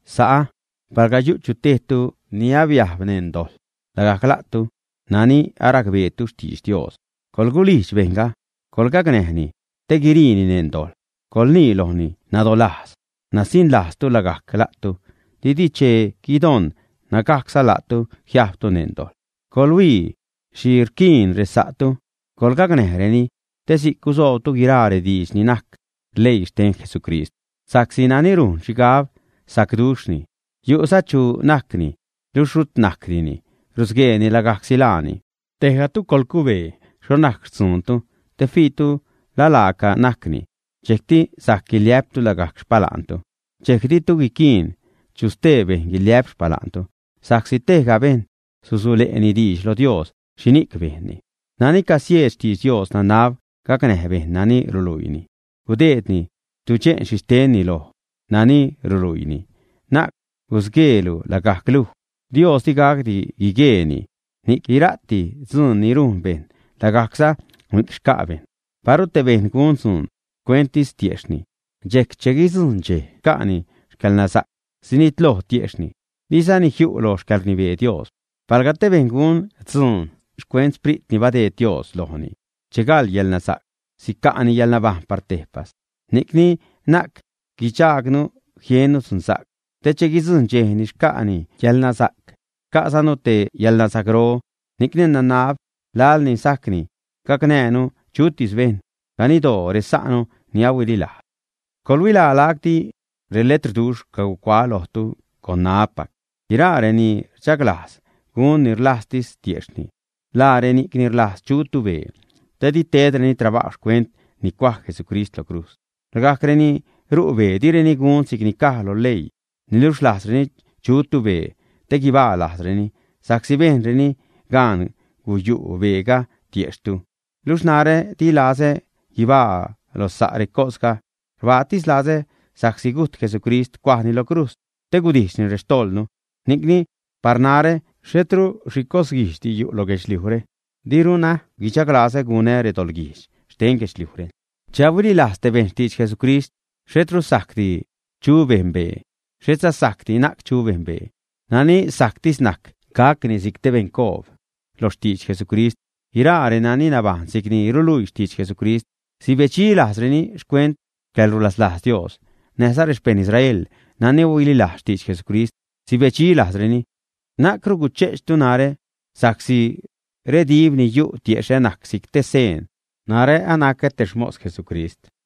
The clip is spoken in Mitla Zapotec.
Sa'ä, palga chu tejtu ni abiajb neṉ dojḻ, lagajc la'tu nani aracbeetu xtidx Dios coḻgulijdx bejṉga, coḻgacnäjni te guiriini neṉ dojḻ. Coḻnii lojni nadolajz, nasiṉlajztu lagajc la'tu didi che guidon nägajcza la'tu jiajbtu neṉ dojḻ. Coḻhuii xhi rquiin resa'tu, coḻgacnäjreni te si'c gusoobtu guiraa rediidx ni najc leii xten Jesucrist. Sa'csi nani rujn xhigab sacduxhni, yu'za chu najcni, niluxh rut najcdini, rusgueeni lagajcsi laani. Tejgatu coḻcubee xho najc xtzuuntu te fiitu la laaca najcni, dxejcti sajc guiliä'ptu lagajc xpala'ntu. Dxejc ditu guiquiin chu stee bejṉ guiliä'p xpala'ntu. Sa'csi tejga bejṉ susule'ni diidx lo Dios xhini'c bejnni. Nani casieed xtidx Dios nanab gacnäj bejṉ nani ruluiini, gudeedni tudxe'n xhixtenni loj nani ruluiini. Na'c gusgueelu lagajc luj. Dios digacdi guigueeni, ni'c guira'ti dzuun ni rujn bejṉ lagajcza ni'c xca' bejṉ. Paru te bejṉ gun dzuun xcuenttis tiejxhni, dxejc che guidzujṉ dxej xca'ni yälnasa'c, sinitloj tiejxhni, dizani jiu' loj xcäḻrnibee Dios. Palga te bejṉ gun dzuun xcuent Sprit ni badeed Dios lojni, che gal yälnasa'c, sica'ni yäḻnabajṉ par tejpas. Ni'cni na'c guidxajgnu jiennu dzunsa'c te che guidzujṉ dxej ni xca'ni yäḻnasa'c, xca'zanu te yäḻnasa'cro. Ni'cni nanab laḻ ni sajcni, gacnäjnu chutis bejṉ, ganiddoo resa'nu ni ahuililajz. Coḻhuilaa lacti reletrduxh cacuaä lojtu con ṉaä́pac. Guiraa reni rdxaglajz gun ni rlajztis tiejxhni, laa reni'c ni rlajz chutu bee, tedi tedreni trabajw xcuent ni cuaj Jesucrist lo crujz. Lagajc reni ru' bee direni gun si'cni caj lo leii, niluxh rlajzreni chutu bee te guibaa lajzreni sa'csi bejnreni gaan guyu' beega tiejxhtu. Luxh narä dilazä guibaa lo sa' recosga; rbaatis lazä sa'csi gujt Jesucrist, cuajni lo crujz, te gudijxni rextojḻnu. Ni'cni par narä xhetru xhi cos-guijdxdi yu' lo guedxliujre, diruna guichaglazä gunä redoḻguijdx xten guedxliujre. Che ahuililajz te bejṉ xtidx Jesucrist, xhetru sajcdi chu bejṉ bee, xhetza sajcdi na'c chu bejṉ bee. Nani sajctis najc gacni si'c te beṉcoob lo xtidx Jesucrist. Guiraa renani nabajṉ si'cni ruluii xtidx Jesucrist sibedxi lajzreni xcuent xcäḻrulaslajz Dios. Näjza rexpeṉ Israel nani ahuililajz xtidx Jesucrist sibedxi lajzreni. Na'cru guche'chtu narä sa'csi redib ni yu' tiexhä najc si'c te seen narä anacä te xmos Jesucrist.